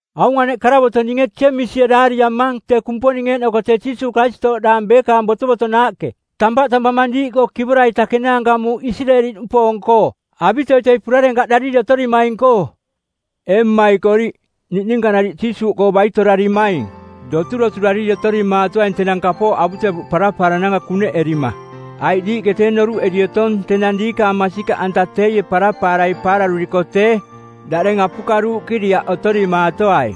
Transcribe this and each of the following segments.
Aung aneꞌ karavoto˜ ninge Jeemisie daariamang tee Kumponing eeꞌnoko tee Jiisuuꞌ Karistooꞌdaang beekaang botovotonaaꞌke. Tampaꞌ tampamang diiꞌkoo kivora-ita kenaanka muuꞌ Isireeli-nupoong-koo avitoitoi purarenkaꞌdariri otorimaing-koo. Ee mmaikoriꞌ, niꞌninka nariꞌ Jiisuuꞌkoo baitorarimaing, doturoturariri otorimaatoaing tenang kapooꞌ avutevuꞌ parapaarananka kuneꞌerima. Aiꞌ diiꞌke tee noruꞌeri otong tenang diikaang masikaꞌanta teie parapaarai paararuriko tee, daꞌdeng apukaruuꞌkiriaꞌ otorimaatoai.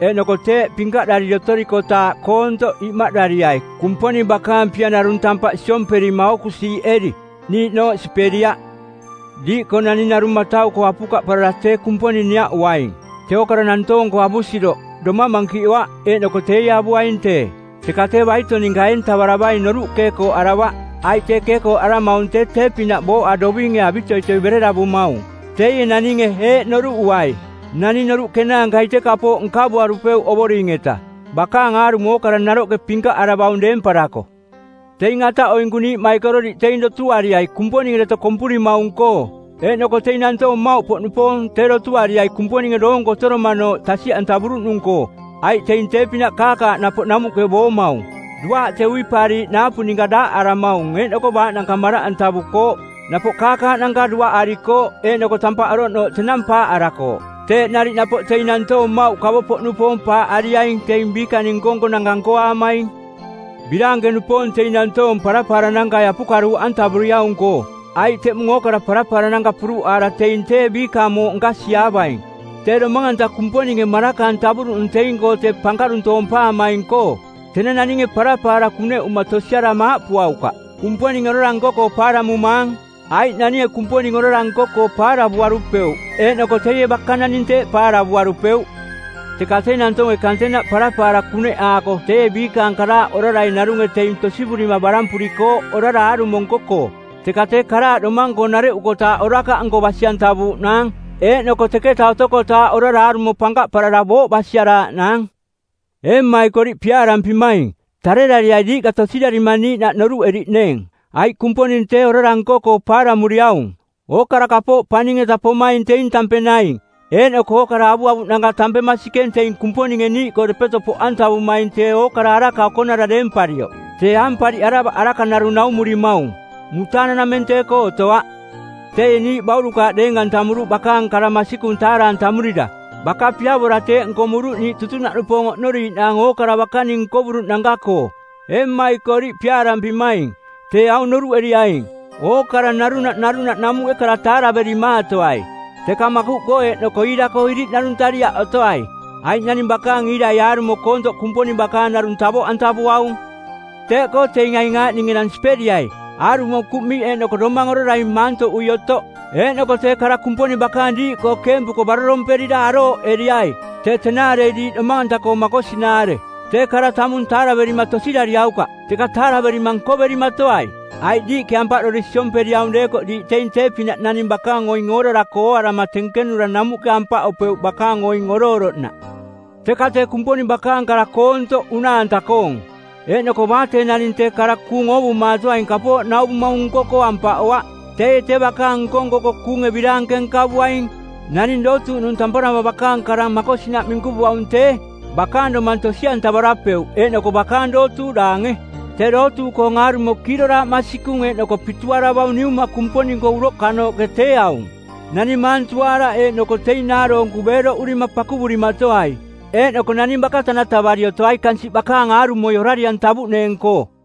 Eeꞌnoko teeꞌ pinkaꞌdariri otorikotaaꞌ koontoꞌ imaꞌdariai Kumponing bakaang pia narung tampaꞌ siomperima ookusiiꞌeri, niiꞌnooꞌ siperiaꞌ. Diiꞌkoo naning narung matau-koo apukaꞌparara tee Kumponing niaꞌuaing, tee ookara nantoong-koo avusiroꞌ, domang mankiꞌoaꞌ, eeꞌnoko teie avuaing tee. Teka tee baito ninka eentavaravaing noruꞌ keekooꞌaravaꞌ, aiꞌ tee keekooꞌaramaung tee tee-pinaꞌ booꞌa dovinge avitoitoi bereravumaung. Teie naninge eeꞌ noruꞌuai: Naning noruꞌ kenaankai tee kapooꞌ nkavuarupeuꞌ Ovoring-eta, bakaang aarumo ookara naroꞌke pinkaꞌaravaung deemparako. Teing ataꞌoinku niiꞌmaikororiꞌ teing dotuariai Kumponinge deto kompurimaung-koo. Eeꞌnoko teing nantoong mmauꞌpoꞌnupoong tee dotuariai Kumponinge doonko otoromanooꞌ tasiꞌantavuruꞌnung-koo, aiꞌ teing tee-pinaꞌ kaakaaꞌ napoꞌ namuꞌke boomaung. Duaaꞌ tee uipaariiꞌ naapu ninka daaꞌaramaung eeꞌnoko baaꞌnanka maraꞌantavukooꞌ, napoꞌ kaakaaꞌnanka duaꞌarikooꞌ eeꞌnoko tampaꞌ oroꞌnooꞌ tenang paaꞌarakooꞌ. Teeꞌ nariꞌ napoꞌ teing nantoong mmauꞌ kavo-poꞌnupoong paaꞌariaing teing biikaning nko-nkonanka nkoaamaing. Biraanke-nupoong teing nantoong parapaaranankai apukaruuꞌantavuriaung-koo, aiꞌ teꞌmung ookara parapaarananka puruꞌaara teing tee biikaang mooꞌ nkasiiaavaing, tee domang-anta Kumponinge maraka-antavuruꞌnung teing-koo tee pankaruntoompaamaing-koo. Tenang naninge parapaara kuneꞌuma tosiarama aaꞌpuaukaꞌ, “Kumponinge orara nko-koo paaramumaang,” aiꞌ naninge Kumponing orara nko-koo paaravuarupeuꞌ eeꞌnoko teie baka naning teeꞌ paaravuarupeuꞌ. Teka tee nantoonge kantenaꞌ parapaara kuneꞌaako teie biikaang karaaꞌ orarai narunge teing tosivurima barampurikooꞌ orara aarumo nko-koo. Teka tee karaaꞌ domang-koo nareꞌukotaaꞌ orakaꞌnko basi-antavuuꞌnaang, eeꞌnoko teketa otokotaaꞌ orara aarumo pankaꞌparara booꞌ basiaraaꞌnaang. Ee mmaikoriꞌ piaarampimaing, tarerariai diiꞌka tosirarima niiꞌnaꞌ noruꞌeriꞌneeng, aiꞌ Kumponing tee orara nko-koo paaramuriaung. Ookara kapooꞌ paning-eta pomaing teing tampeng naing, eeꞌnoko ookara avuavuꞌnanka tampeng masikeng teing Kumponinge niiꞌkoo depeto poꞌantavumaing tee Ookara Araka Okonara deemparioꞌ. Tee aampariꞌaravaꞌ araka narung naumurimaung. Mutaananameng tee-koo otoaꞌ. Teie niiꞌ baurukaaꞌ deeng-antamuruꞌ bakaang kara masikung taara-antamurira. Baka piavora teeꞌ nkomuruꞌ niiꞌ tutunaꞌnupoong oꞌnoriiꞌnaang ookara bakaning nkovuruꞌnanka-koo. Ee mmaikoriꞌ piaarampimaing, tee aung noruꞌeriaing: Ookara narunaꞌ narunaꞌ namuꞌke kara taaraverimaatoai, teka makuꞌkoo eeꞌnoko iira-koo iriꞌnaruntariaꞌ otoai, aiꞌ naning bakaang iirai aarumo koontoꞌ Kumponing bakaang narung tavoꞌantavuaung. Teeꞌkoo teing aing aaꞌning enang siperiai: aarumo kuꞌmiꞌ eeꞌnoko domang orarai maantoꞌui otoꞌ; eeꞌnoko tee kara Kumponing bakaang diiꞌkoo keempuko baroromperira arooꞌeriai, tee tenaarei diiꞌ domang-anta-koo makosinaare. Tee kara tamung taaraverima tosirariaukaꞌ, teka taaraverima nkoverimatoai. Aiꞌ diiꞌke ampaꞌdori siomperiaung deekoꞌ diiꞌ teing tee-pinaꞌ naning bakaang oing oorara-koo ooarama tenkenura namuꞌke ampaꞌopeuꞌ bakaang oing oroꞌoroꞌnaꞌ. Teka tee Kumponing bakaang kara koontoꞌ unaa-anta-koong, eeꞌnoko baa tee naning tee kara kuung oovumatoaing kapooꞌ nauvumaung nko-koo ampaꞌoaꞌ, teie tee bakaang nko-nko-koo kuunge biraanke nkavuaing. Naning dootuuꞌnung tamparama bakaang karang makosinaꞌ minkuvuaung tee, bakaang domang tosi-antavarapeuꞌ eeꞌnoko bakaang dootuuꞌ daange. Tee dootuuꞌkoong aarumo kiiroraaꞌ masikung eeꞌnoko pituaravaung Niuma Kumponing-koo uroꞌkanooꞌke tee aung: Naning maantuaaraꞌ eeꞌnoko teing naaroonku beeroꞌurima pakuvurimatoai eeꞌnoko naning baka tanatavari otoai kansiꞌ bakaang aarumo orari-antavuꞌneeng-koo.